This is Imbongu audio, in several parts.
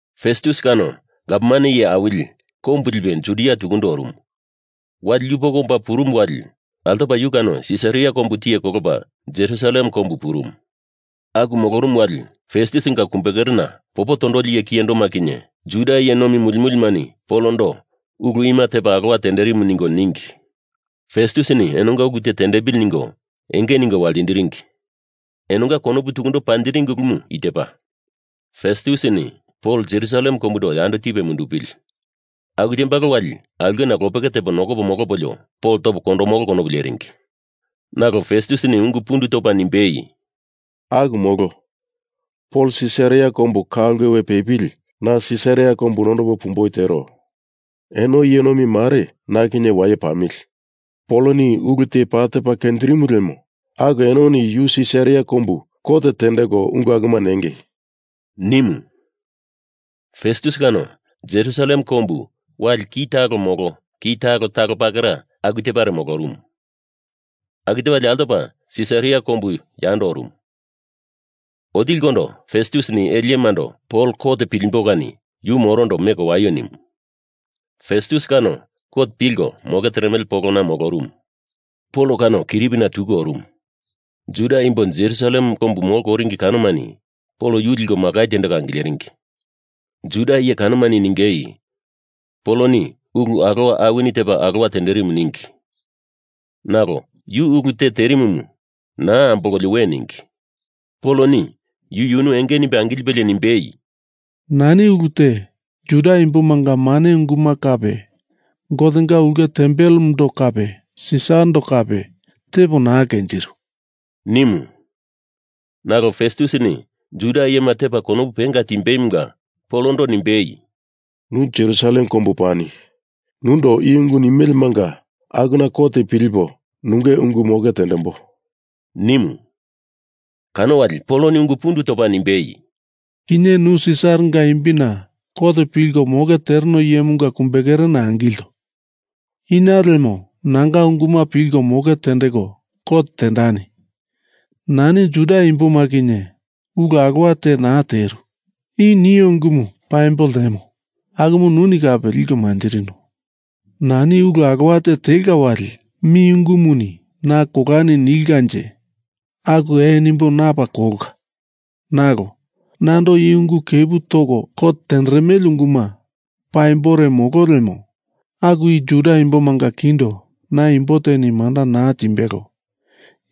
Festus kano gavman iye awili kombu lipe Judia tukundo orumu. Wali yupoko omba purumu wali altopa yu kano Sisaria kombu tiye kolopa Jerusalem kombu purumu. Aku molorumu wali Festusinga kumbekerena popo tondoli iye kiyendoma kinye Juda iye nomi muli mulimani Polondo ulu ima tepa alowa terimu ningo ningi. Festusini enonga ulu te tendepili ningo enge ningo waltindiringi. Enonga konopuna tukundo panjiringi ulumu i tepa, Festusini Pol Jerusalem kombundo yando tipe mundupili. Aku tembalo wali aulkena lopeke tepo nokopo molopolio Pol topo kondomolo konopu leringi. Nalo Festusini ungu pundu topa nimbei, “Aku molo, Pol Sisaria kombu ka ulke we pepili. Na Sisaria kombu nondopo pumboi tero. Eno iye nomi mare na kinye waye pamili. Poloni ulu te paa tepa kenjirimu lemo aku enoni yu Sisaria kombu kot tendeko ungu akuma nengei,” nimu. Festus kano Jerusalem kombu wali ki talo molo ki talo talo pakera aku tepare molorumu. Aku tepalie altopa Sisaria kombu yando orumu. Otilikondo Festusini ele iyemando Pol kot pilimbo kani yu morondo meko waio nimu. Festus kano kot pilko moke teremele polona molorumu. Pol kano kiripina tuku orumu. Juda imbo Jerusalem kombu molko oringi kanomani Pol yu liko makai tendeko angileringi. Juda iye kanomani ningei Poloni ulu alowa awini tepa alowa tenderimu ningi. Nalo yu ulu te terimumu naa ambolkolio we ningi. Poloni yu yunu enge nimbe angilipe nimbei, “Nani ulu te Juda imbomanga mane unguma kape Gotenga ulke tempelemundo kape Sisarando kape tepo naa kenjiru,” nimu. Nalo Festusini Juda iyema tepa konopu penga timbeimunga Polondo nimbei, “Nu Jerusalem kombu pani. Nundo i ungu nimelemanga akuna kot pilipo nunge ungu moke tendembo,” nimu. Kano wali Poloni ungu pundu topa nimbei, “Kinye nu Sisaranga imbina kot pilko moke tereno iyemunga kumbekerena angilto. Ina lemo nanga unguma pilko moke tendeko kot tendani. Nani Juda imboma kinye ulu alowa te naa teru. I nio ungumu paimbo ltemo akumu nuni kape liko manjirino. Nani ulu alowa te telka wali mi ungumuni na kolani nilkanje aku ee nimbo na paa kolka. Nalo nando i ungu kepu toko kot tenderemele unguma paimbore molo lemo aku i Juda imbomanga kindo na imbo teni manda naa timbelo.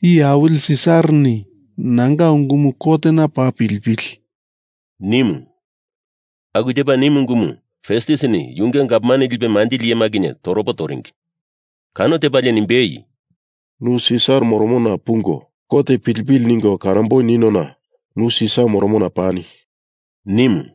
Iye awili Sisarani nanga ungumu kotena paa pilipili,” nimu. Aku tepa nimu ungumu Festusini yunge gavman lipe manjili iyema kinye toropo toringi. Kano tepalie nimbei, “Nu Sisar moromona pungo kot pilipili ningo kanomboi niniona nu Sisar moromona pani,” nimu.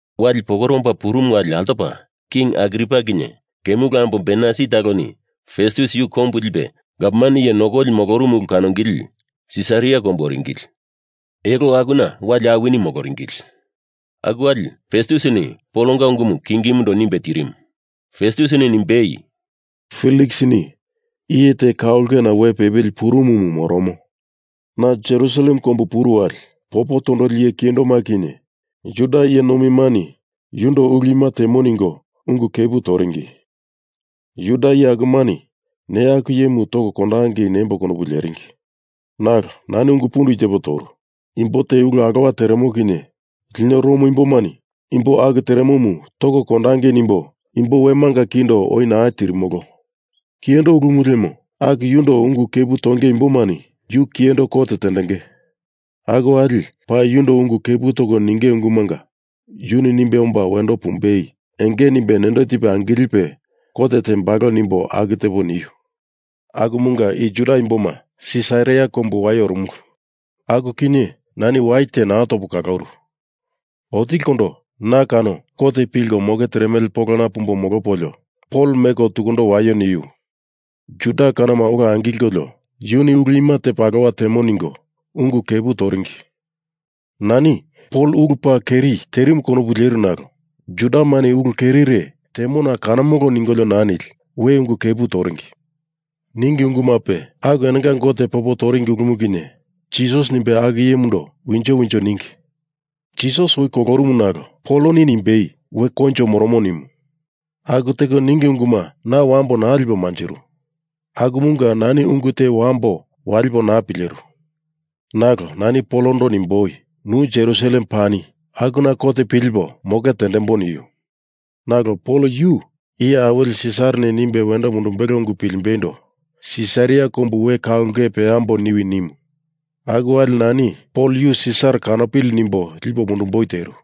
Wali pokore omba purumu wali altopa King Agripa kinye kemulu ambo Bernaisi taloni Festus yu kombu lipe gavman iye nokoli molorumu ulu kanongili Sisaria kombu oringili. Elo akuna wali awini moloringili. Aku wali Festusini Polonga ungumu Kingimundo nimbe tirimu. Festusini nimbei, “Feliksini iye te ka ulkena we pepili purumumu moromo. Na Jerusalem kombu puru wali, popo tondoli iye kiyendoma kinye Juda iye nomimani yundo ulu ima temo ningo ungu kepu toringi. Juda iye akumani neya aku iyemu toko kondopangei nembo konopu leringi. Nalo nani ungu pundu i tepo toru. Imbo te ulu alowa teremo kinye lino Rom imbomani imbo aku teremomu toko kondangei nimbo imbo wemanga kindo oi naa tirimolo. Kiyendo ulumu lemo aku yundo ungu kepu tonge imbomani yu kiyendo kot tendenge. Aku wali paa yundo ungu kepu toko ninge ungumanga yunu nimbe omba wendo pumbei enge nimbe nendo tipe angilipe kot tembalo, nimbo aku tepo niu. Akumunga i Juda imboma Sisaria kombu waye orumulu. Aku kinye nani wai te naa topo kaloru. Otilikondo na kano kot pilko moke teremele polona pumbo molopolio Pol meko tukundo waio niu. Juda kanoma ola angilkolio yuni ulu ima tepa alowa temo ningo ungu kepu toringi. Nani Pol ulu paa keri terimu konopu leru nalo Judamani ulu kerire temona kanomolo ningolio naa nili we ungu kepu toringi. Ningi ungumape aku enonga Gote popo toringi ulumu kinye Jisas nimbe aku iyemundo winjo winjo ningi. Jisas oi kolorumu nalo Poloni nimbei, we koinjo moromo nimu. Aku teko ningi unguma na wambo naa lipo manjiru. Akumunga nani ungu te wambo walipo naa pileru. Nalo nani Polondo nimboi, nu Jerusalem pani akuna kot pilipo moke tendembo niu. Nalo Pol yu iye awili Sisarani nimbe wendo mundumbelo ungu pilimboindo Sisaria kombu we ka ulke peambo niwi nimu. Aku wali nani Pol yu Sisar kanopili nimbo lipo mundumboi teru.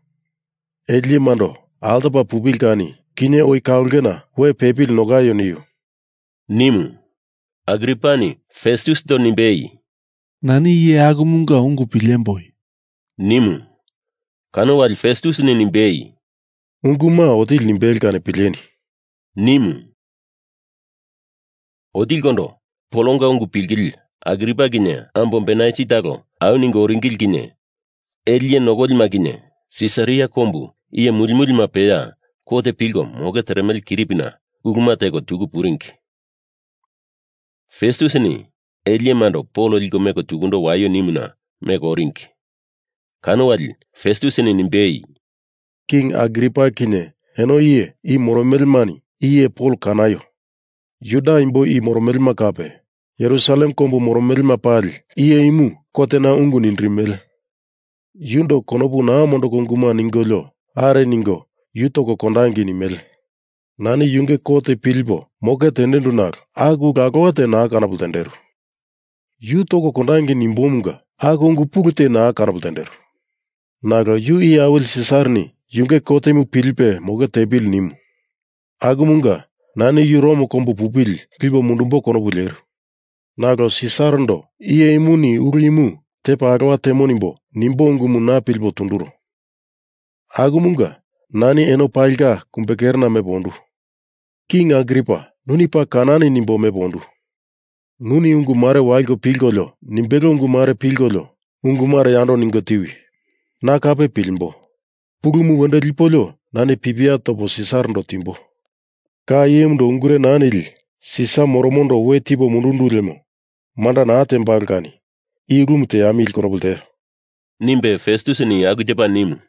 Ele iyemando altopa pupili kani kinye oi ka ulkena we pepili nokaio niu,” nimu. Agripani Festusindo nimbei, “Nani iye akumunga ungu pilemboi,” nimu. Kano wali Festusini nimbei, “Unguma otili nimbelo kani pileni,” nimu. Otilikondo Polonga ungu pilingili Agripa kinye ambo Bernaisi talo au ningo oringili kinye ele iye nokolima kinye Sisaria kombu iye muli mulima peya kot pilko moke teremele kiripina uluma teko tuku puringi. Festusini ele iyemando Pol liko meko tukundo waio nimuna meko oringi. Kano wali Festusini nimbei, “King Agripa, kinye eno iye i moromolomani i iye Pol kanaio. Juda imbo i moromelema kape Jerusalem kombu moromelema palini iye imu kotena ungu nindirimele. Yundo konopu naa mondoko unguma ningolio are ningo yu toko kondangei nimele. Nani yunge kot pilipo moke tendendu nalo aku ulu alowa te naa kanopo ltenderu. Yu toko kondangei nimbomunga aku ungu pulu te naa kanopo ltenderu. Nalo yu Iye awili Sisarini yunge kotemu pilipe moke tepili nimu. Akumunga nani yu Rom kombu pupili lipo mundumbo konopu leru. Nalo Sisarando iye imuni ulu imu tepa alowa temo nimbo nimbo ungumu na pilipo tunduro. Akumunga nani eno palinga kumbekerena mepo ondu. King Agripa, nuni paa kanani nimbo mepo ondu. Nuni ungu mare waliko pilkolio nimbelo ungu mare pilkolio ungu mare yando ningo tiwi. Na kape pilimbo. Pulumu wendo lipolio nani pipia topo Sisarando timbo. Ka iyemundo ungure naa nili Sisar moromondo we tipo mundundu lemo manda naa tembalo kani i ulumu teamili konopu lteo,” nimbe Festusini aku tepa nimu.